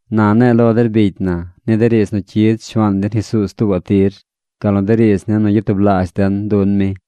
Na ne̱e̱ lo der bicy na ni de riidz nu cyid Shuaan den Jesuuz tuubaꞌ tir, gal nu de riidz ni nu gyatublaazh den dun mi.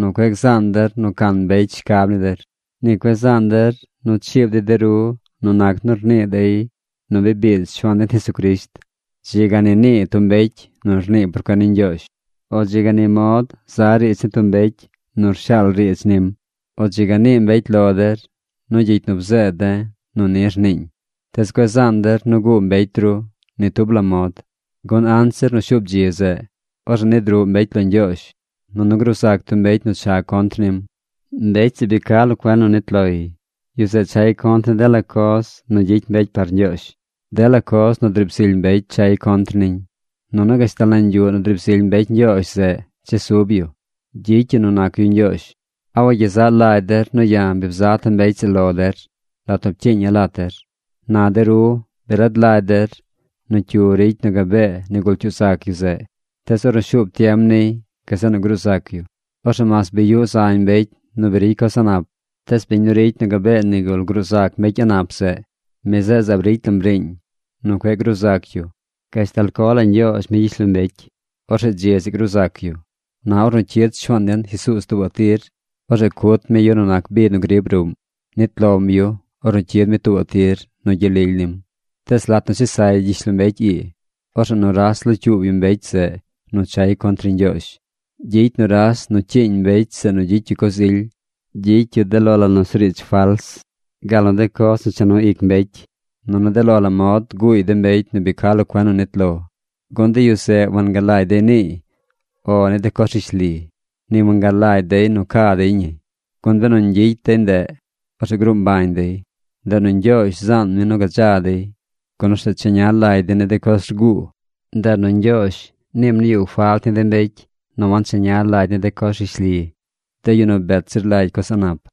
cueꞌ gzaan der nu can mbecy shcab ni der. Ni cueꞌ zaan der nu chiib dey de ru nu nac nu rnii dey nu bi biid Shuaan den Jesucrisht. Dzi ga ni nii tub mbecy nu rnii por cuen ni Ñgyoozh. O dzi ga ni mod za riidz ni tub mbecy nu rshaal riidz nim. O dzi ga nii mbecy lo der nu gyicy nu bzeed de̱ nu ni rniiñ. Tees cueꞌ zaan der nu guu mbecy ru ni tub la mod. Gun anzir nu shuub dzi zeꞌ, orzeꞌ nid ruꞌ mbecy lo Ñgyoozh, nunu gruu zac tub mbecy nu cha contr nim. Mbecy zeꞌ bi ca lo cuen nu nit loy. Yu zeꞌ chay contr ni dela coz nu gyicy mbecy par ñgyoozh. Dela coz nu driib zily mbecy chay contr niñ. Nunu gashtal nañ yuꞌ nu driib zily mbecy Ñgyoozh zeꞌ chesub yu. Gyicy yu nu nac yu ñgyoozh. ¿A wagyezaꞌ lagy der nu ya̱ bi bzata̱ mbecy zeꞌ lo der lat nu pcyiiña̱ lat der? Na de ru bi rad lagy der nu cyu ricy nu gabee nigul cyuu zac yu zeꞌ. Tees ornu shuub tiem niy, gazeꞌ nu gruu zac yu. Orzeꞌ mas bi yuꞌ zañ mbecy nu bi ricy coz a̱ꞌ nap, tees biñ nu ricy nu gabee nigul gruu zac mbecy a̱ꞌ nap zeꞌ, mi zeꞌ zaab ricy lam riiñ nu cueꞌ gruu zac yu gashtal co la Ñgyoozh mi gyishlombecy. Orzeꞌ dzi zeꞌ gruu zac yu. Na ornu cyid Shuaan den Jesuuz tuubaꞌ tir, orzeꞌ cut mi yu nu nac bi nu griib ruꞌm. Nit lom yu ornu cyid mi tuubaꞌ tir nu gyel lily nim. Tees lat nu chesay gyishlombecy ii, orzeꞌ nuras locyuub yu mbecy zeꞌ nu chay contr ni Ñgyoozh. Gyicy nuras nu cyiiñ mbecy zeꞌ nu gyicy yu coz ily. Gyicy yu de lo la nusuriidz fals, gal nu de coz nu cha nu ic mbecy. Nunu de lo la mod guuy de mbecy nu bi ca lo cuen nu nit lo, gun de yu zeꞌ wangalagy dey niiy “O” ni de coz rishli. Ni wangalagy dey nu ca dey ñi. Gun benu ñgyicy dey ndeꞌ, orzeꞌ gruu mbañ dey. Ndeꞌ nu Ñgyoozh zaan mi nu gadza dey, gun orzeꞌ cheña lagy dey ni de coz rguu. Ndeꞌ nu Ñgyoozh niim nu yuꞌ falt ni de mbecy nu wancheña lagy ni de coz rishli, de yu nu bet zir lagy coz a̱ꞌ nap.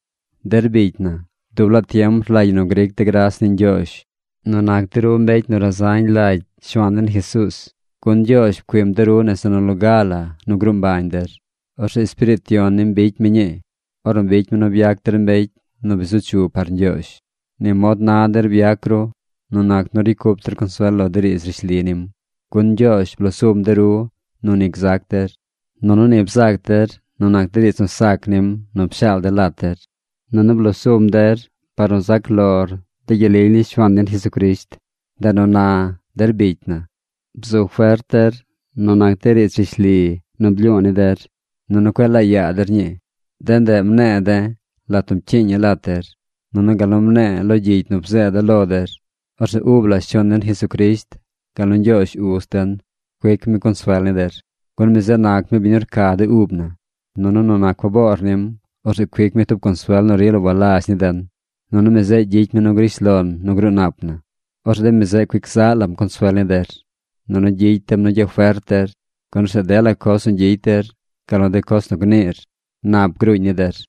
Der bicy na, dub laa tiem rlagy ñi nu gric de̱ gras ni Ñgyoozh nu nac de ru mbecy nu razañ lagy Shuaan den Jesuuz. Gun Ñgyoozh pcuim de ru nese nu loga la nu gruu mbañ der. Orzeꞌ Espiriit Yon nim bicy mi ñii, ornu bicy mi nu byac der mbecy nu bi zu chu par Ñgyoozh. Ni mod na der byac ru nu nac nu ricy cup der consuel lo de riidz rishli nim. Gun Ñgyoozh blo sum de ru nu ni gzac der, nunu ni bzac der nu nac de riidz nu sac nim nu pshaal de̱ lat der. Nunu blosum der par nu zac lor de gyel lily ni Shuaan den Jesucrisht. Ndeꞌ nu na, der bicy na, bzu fert der nu nac de riidz rishli nu blyu̱u̱ ni der, nunu cueꞌ laa yaa der ñii. De ndeꞌ mne̱e̱ de̱ lat nu rcyiiña̱ lat der, nunu gal nu mne̱e̱ lo gyicy nu bzeeda̱ lo der. Orzeꞌ ub la Shuaan den Jesucrisht gal nu Ñgyoozh Uz den cuic mi consuel ni der. Gun mi zeꞌ nac mi biñ nu rca de ub na. Nunu nu nac faboor nim, orzeꞌ cuic mi tub consuel nu rila walazh ni den. Nunu mi zeꞌ gyicy mi nu grish lon nu gruu nap na. Orzeꞌ de mi zeꞌ cuic zaꞌ lam consuel ni der. Nunu gyicy dem nu gyafert der, gun orzeꞌ dela coz nu gyicy der gal nu de coz nu gniir, nap gruuñ ni der.